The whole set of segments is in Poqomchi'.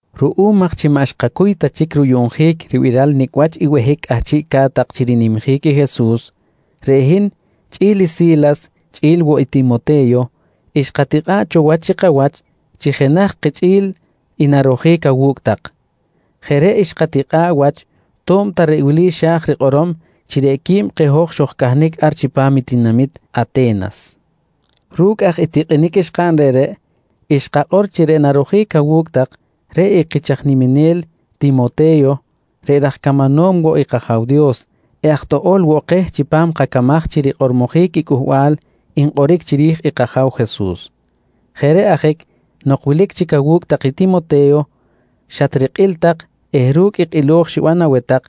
Ruꞌum aj chi maꞌ xkacuy ta chic ruyuꞌnjic ribiral nicꞌ wach i behic cꞌahchiꞌ ca̱t-tak chi rinimjic i Jesus, reꞌ hin chꞌi̱l i Si̱las chꞌi̱l woꞌ i Timote̱yo xkatikꞌa̱ꞌ cho wach chi kawach chi jenaj kichꞌi̱l i narojic awu̱cꞌ tak. Jeꞌ reꞌ xkatikꞌa̱ꞌ wach to̱b ta reꞌ wili xa̱j rikꞌorom chi qui̱b keh hoj xojcahnic ar chipam tinamit Ate̱nas. Ru̱cꞌ aj i tikꞌinic xkaꞌn reꞌreꞌ, xkakꞌor chi reꞌ narojic awu̱cꞌ tak, reꞌ i kich aj niminel Timote̱yo reꞌ raj camanom woꞌ i kAja̱w Dios eh aj toꞌo̱l woꞌ keh chipam kacamaj chi rikꞌormojic i cꞌuhbal nkꞌoric chiri̱j i kAja̱w Jesus. Jeꞌ reꞌ ajic nok wilic chic awu̱cꞌ tak i Timote̱yo, xatrikꞌil tak eh ru̱cꞌ i kꞌilo̱j xiban aweh tak,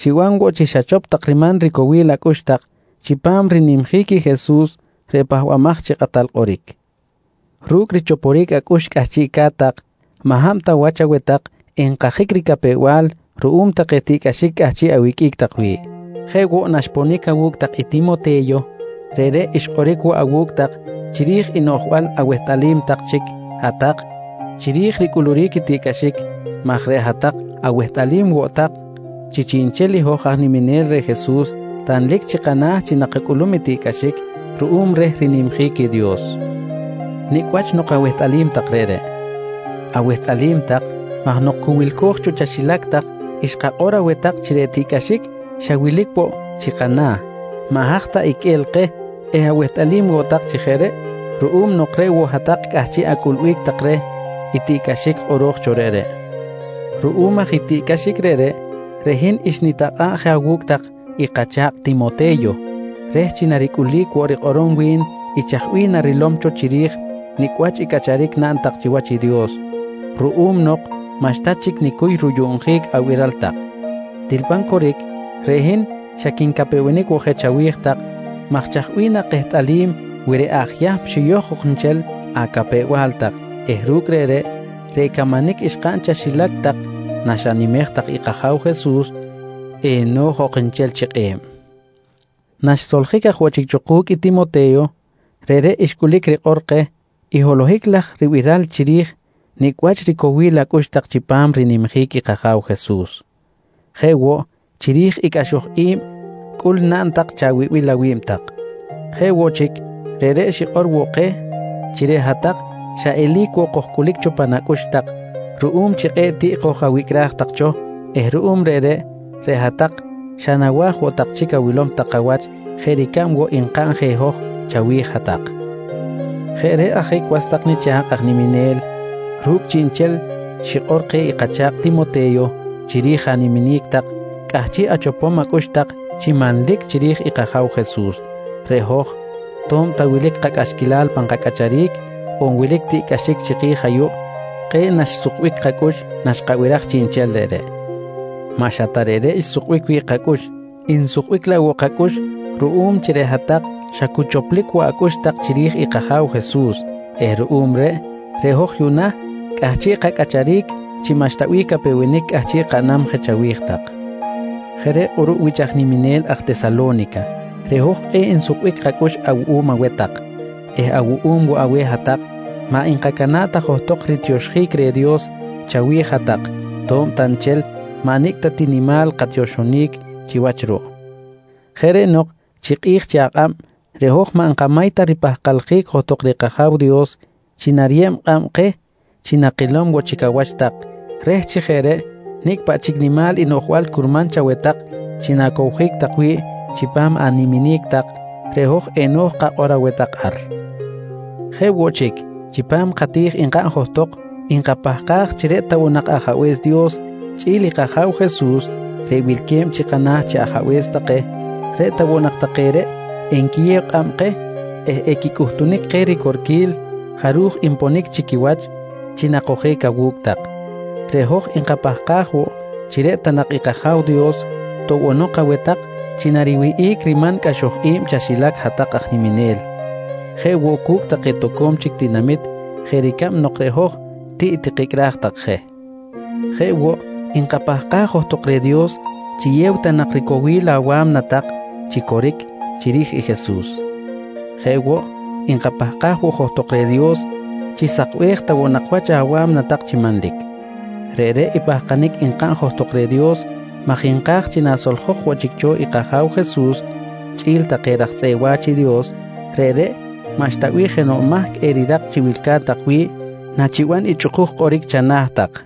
xiban woꞌ chi xachop tak riman ricowil acꞌux tak chipam rinimjic i Jesus reꞌ Pahbamaj chi Kꞌatal Kꞌoric. Ru̱cꞌ richoporic acꞌux cꞌahchiꞌca̱t tak, maꞌ hab ta wach aweh tak enkajic ricapew-bal ruꞌum take tiꞌcꞌaxic cꞌahchiꞌ awiqꞌuic tak wi̱ꞌ. Jeꞌ woꞌ naxponic awu̱cꞌ tak i Timote̱yo, reꞌreꞌ xkꞌoric woꞌ awu̱cꞌ tak chiri̱j i noꞌjbal awehtꞌalim tak chic hat-tak chiri̱j ricꞌuluric i tiꞌcꞌaxic maj reꞌ hat-tak awehtꞌalim woꞌ tak chi chiꞌnchel i hoj aj niminel reh Jesus tanlic chi kana̱ chi nakacꞌulum i tiꞌcꞌaxic ruꞌum reh rinimjic i Dios. Nicꞌ wach nok awehtꞌalim tak reꞌreꞌ? Awehtꞌalim tak maj nok cu wilco̱j cho chaxilac tak xkakꞌor aweh tak chi reꞌ tiꞌcꞌaxic xa wilic woꞌ chi kana̱ maꞌ haj ta iqꞌue̱l keh eh awehtꞌalim woꞌ tak chi jeꞌ reꞌ ruꞌum nok reꞌ woꞌ hat-tak cꞌahchiꞌ acꞌulbic tak reh tiꞌcꞌaxic kꞌoro̱j cho reꞌreꞌ. Ruꞌum aj i tiꞌcꞌaxic reꞌreꞌ, reꞌ hin xnitakꞌa̱ꞌ je awu̱cꞌ tak i kacha̱kꞌ Timote̱yo reh chi naricꞌulic woꞌ rikꞌorom wi̱n i chaj bih narilom cho chiri̱j nicꞌ wach i cꞌacharic naꞌn tak chiwach i Dios ruꞌum nok maꞌxta chic nicuy ruyuꞌnjic abiral tak. Til pan coric, reꞌ hin xa quincapewenic woꞌ je chawi̱j tak maj chaj bih nakehtꞌalim wi reꞌ aj Yahm xiyoj ok nchel acapew-bal tak eh ru̱cꞌ reꞌreꞌ, reꞌ camanic xkaꞌn chaxilac tak naxanimej tak i kAja̱w Jesus, eno̱j ok nchel chi kꞌe̱b. Naxsoljic aj woꞌ chic cho ku̱cꞌ i Timote̱yo, reꞌreꞌ xcꞌulic rikꞌor keh i holohic laj ribiral chiri̱j nicꞌ wach ricowil acꞌux tak chipam rinimjic i kAja̱w Jesus, jeꞌ woꞌ chiri̱j i cꞌaxoj i̱b cꞌul naꞌn tak chawibil awi̱b tak. Jeꞌ woꞌ chic, reꞌreꞌ xikꞌor woꞌ keh chi reꞌ hat-tak xa eli̱c woꞌ kojcꞌulic cho pan acꞌux tak ruꞌum chi kꞌe̱ꞌ tiꞌ koj-awicꞌraj tak cho eh ruꞌum reꞌreꞌ, reꞌ hat-tak xa nawa̱j woꞌ nak chic awilom tak kawach jeꞌ ricab woꞌ nkaꞌn je hoj chawi̱j hat-tak. Jeꞌ reꞌ ajic was tak nicha̱kꞌ aj niminel, ru̱cꞌ chiꞌnchel xikꞌor keh i kacha̱kꞌ Timote̱yo chiri̱j animinic tak chi cꞌahchiꞌ achopom acꞌux tak chi manlic chiri̱j i kAja̱w Jesus, reꞌ hoj to̱b ta wilic kacꞌaxquilal pan kacꞌacharic, on wilic tiꞌcꞌaxic chiki̱j ayuꞌ, kꞌe̱ꞌ naxsukbic kacꞌux naxkabiraj chiꞌnchel reꞌreꞌ. Maꞌ xa ta reꞌreꞌ xsukbic wi̱ꞌ kacꞌux, nsukbic laꞌ woꞌ kacꞌux ruꞌum chi reꞌ hat-tak xa cu choplic woꞌ acꞌux tak chiri̱j i kAja̱w Jesus eh ruꞌum reꞌ, reꞌ hoj yuꞌna cꞌahchiꞌ kacꞌacharic chi maꞌxta bih capewenic cꞌahchiꞌ kaꞌnam je chawi̱j tak. Jeꞌ reꞌ kꞌuruꞌ wich niminel aj Tesalo̱nica, reꞌ hoj kꞌe̱ꞌ nsukbic kacꞌux awuꞌum aweh tak eh awuꞌum woꞌ aweh hat-tak maꞌ nkacana̱ꞌ ta johtok ritioxjic reh Dios chawi̱j hat-tak to̱b ta nchel maꞌ nicꞌ ta ti nimal katioxonic chiwach ruꞌ. Jeꞌ reꞌ nok chi kꞌi̱j chi akꞌab reꞌ hoj maꞌ nkamay ta ripahkaljic johtok reh kAja̱w Dios chi nariyeb kꞌab keh chi nakilom woꞌ chic awach tak reh chi jeꞌ reꞌ nicꞌ paꞌ chic nimal i noꞌjbal curman chaweh tak chi na̱cowjic tak wi̱ꞌ chipam animinic tak, reꞌ hoj eno̱j kakꞌor aweh tak ar. Jeꞌ woꞌ chic, chipam kati̱j nkaꞌn johtok nkapahkaj chi reꞌ ta woꞌ nak Ajabe̱s Dios chꞌi̱l i kAja̱w Jesus reꞌ wilque̱b chi kana̱ chi Ajabe̱s take, reꞌ ta woꞌ nak take reꞌ enquiyew kꞌab keh eh equicꞌuhtunic keh ricorquil jaruj nponic chi quiwach chi nakojic awu̱cꞌ tak. Reꞌ hoj nkapahkaj woꞌ chi reꞌ ta nak i kAja̱w Dios toꞌbonok aweh tak chi nariwihꞌic riman cꞌaxoj i̱b chaxilac hat-tak aj niminel, jeꞌ woꞌ cu̱cꞌ take toco̱m chic tinamit jeꞌ ricab nok reꞌ hoj tiꞌ tikicꞌraj tak je. Jeꞌ woꞌ, nkapahkaj johtok reh Dios chiyew ta nak ricowil awa̱mna tak chi coric chiri̱j i Jesus. Jeꞌ woꞌ nkapahkaj woꞌ johtok reh i Dios, chi sakbej ta woꞌ nak wach awa̱mna tak chi manlic. Reꞌreꞌ i pahkanic nkaꞌn johtok reh Dios maj nka̱j chi nasoljok woꞌ chic cho i kAja̱w Jesus chꞌi̱l take raj tzꞌeꞌ wa̱ch i Dios, reꞌreꞌ maꞌxta bih jenoꞌ mahc erirak chi wilca̱t tak wi̱ꞌ nachiban i chꞌuk kꞌoric chana̱ tak.